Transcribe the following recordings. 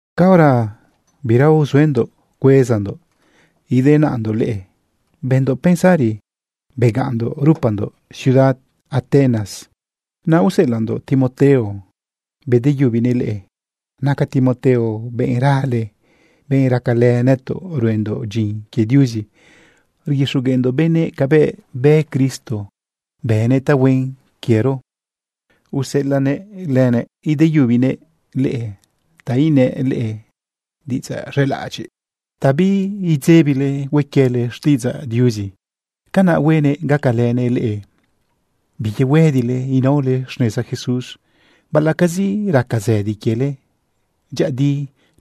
Caora bira uzuendoꞌ cuezandoꞌ idenaꞌndoꞌ leꞌe, bëndoꞌ pensari begaꞌnndoꞌ rupandoꞌ ciudad Atenas, naꞌ useꞌelaꞌndoꞌ Timoteo bedeyubinëꞌ leꞌe. Naca Timoteo benꞌ rale, benꞌ racalë nëtoꞌ ruendoꞌ dyin quie Diuzi rguixogueꞌndoꞌ benëꞌ cabëꞌ bë Cristo, bënëꞌ tahuen quiero. Useꞌelaꞌ lëbiꞌ ideyubinëꞌ leꞌe ta inëꞌ leꞌe diꞌidzaꞌ z̃elaꞌadyiꞌ ta biidzebile hue quiele xtiꞌidzaꞌ Diuzi. Canaꞌ huenëꞌ gacalënëꞌ leꞌe biyehuëdile inaole xneza Jesús baꞌalaꞌcazi raca zëdi quiele. Dyëꞌëdi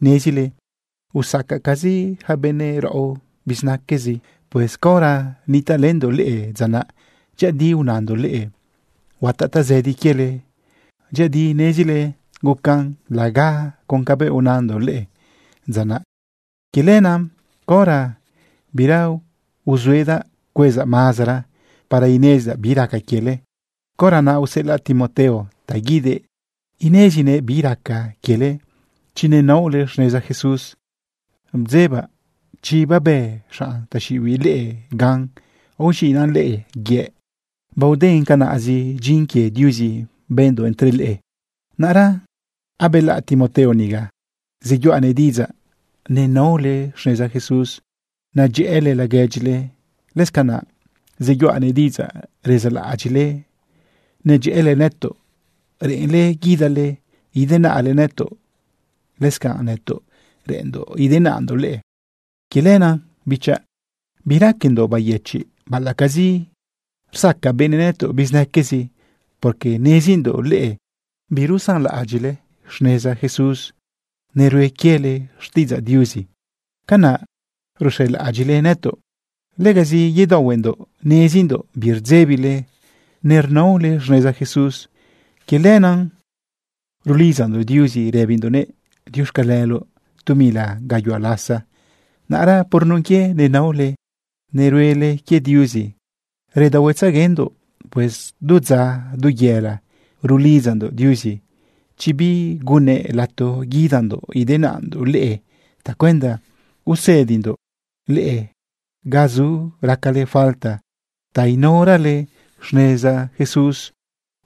nezile usacacazi yaca benëꞌ raꞌo bizinaquezi. Pues caora nitaꞌlëndoꞌ leꞌe dza naꞌ, dyëꞌëdi unandoꞌ leꞌe huataꞌ tazëdi quiele. Dyëꞌëdi nezile gucan laga con cabëꞌ unandoꞌ leꞌe dza naꞌ. Quie lenaꞌ, caora bira uzuedaꞌ cuezaꞌ mazara para inezidaꞌ bi raca quiele, caora naꞌ useꞌelaꞌ Timoteo ta guidëꞌ inezinëꞌ bi raca quiele chi nenaole xneza Jesús. Bdzebaꞌ chi babë xanꞌ taxiꞌibiꞌ leꞌe gan, aoz̃iꞌna leꞌe yëꞌ, baoden canaꞌzi dyin quie Diuzi bëndoꞌ entre leꞌe. Naꞌra abelaꞌ Timoteo niga, zeyuꞌanëꞌ diꞌidzaꞌ nenaole xneza Jesús, nadyëꞌële laguedyile. Lëscanaꞌ zeyuꞌanëꞌ diꞌidzaꞌ rezaꞌlaꞌadyiꞌle nedyëꞌële nëtoꞌ, reꞌenle guidale idenaꞌle nëtoꞌ. Lëscanꞌ nëtoꞌ reꞌenndoꞌ idenaꞌndoꞌ leꞌe. Quie lenaꞌ, bichaꞌ, biraquendoꞌ bayëchiꞌ baꞌalaꞌcazi rsaca benëꞌ nëtoꞌ bizinaquezi, porque nezindoꞌ leꞌe birusanlaꞌadyiꞌle xneza Jesús, nerue quiele xtiꞌidzaꞌ Diuzi. Canaꞌ ruxelaꞌadyiꞌle nëtoꞌ. Legazi yedaohuendoꞌ nezindoꞌ birdzebile nernaole xneza Jesús. Quie lenaꞌ rulidzandoꞌ Diuzi rëbindoꞌnëꞌ diuxcaleloꞌ tu mila gayuhua lasa. Naꞌra por nun quie nenaole neruele quie Diuzi, redaohuetzeguendoꞌ. Pues du dza, du yela, rulidzandoꞌ Diuzi chi bigunnëꞌ lato guidandoꞌ idenaꞌndoꞌ leꞌe tacuenda usëdindoꞌ leꞌe ga zu racale falta ta inaorale xneza Jesús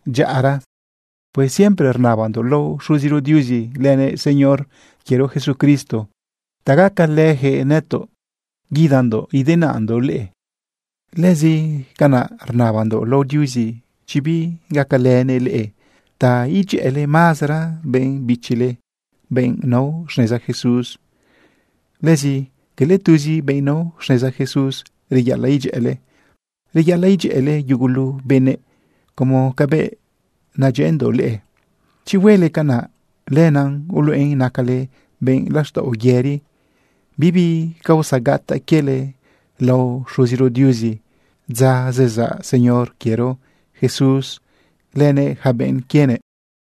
dyaꞌara. Pues siempre rnabandoꞌ lao Xuziro Diuzi lënëꞌ Señor quiero Jesucristo ta gacalëyaquëꞌ nëtoꞌ guidandoꞌ idenaꞌndoꞌ leꞌe. Lëscanaꞌ rnabandoꞌ lao Diuzi chi bigacalënëꞌ leꞌe ta idyëꞌële mazara benꞌ bichile, benꞌ nao xneza Jesús. Lëzi cala tuzi benꞌ nao xneza Jesús reyaꞌalaꞌ idyëꞌële, reyaꞌalaꞌ idyëꞌële yugulu benëꞌ como cabëꞌ nadyëꞌëndoꞌ leꞌe. Chi huele canaꞌ, lenaꞌ uluꞌen nacale benꞌ laxtaꞌo yëri, bibi causa gataꞌ quiele lao Xuziro Diuzi dza zezaꞌ Señor quiero Jesús lënëꞌ yaca benꞌ quienëꞌ.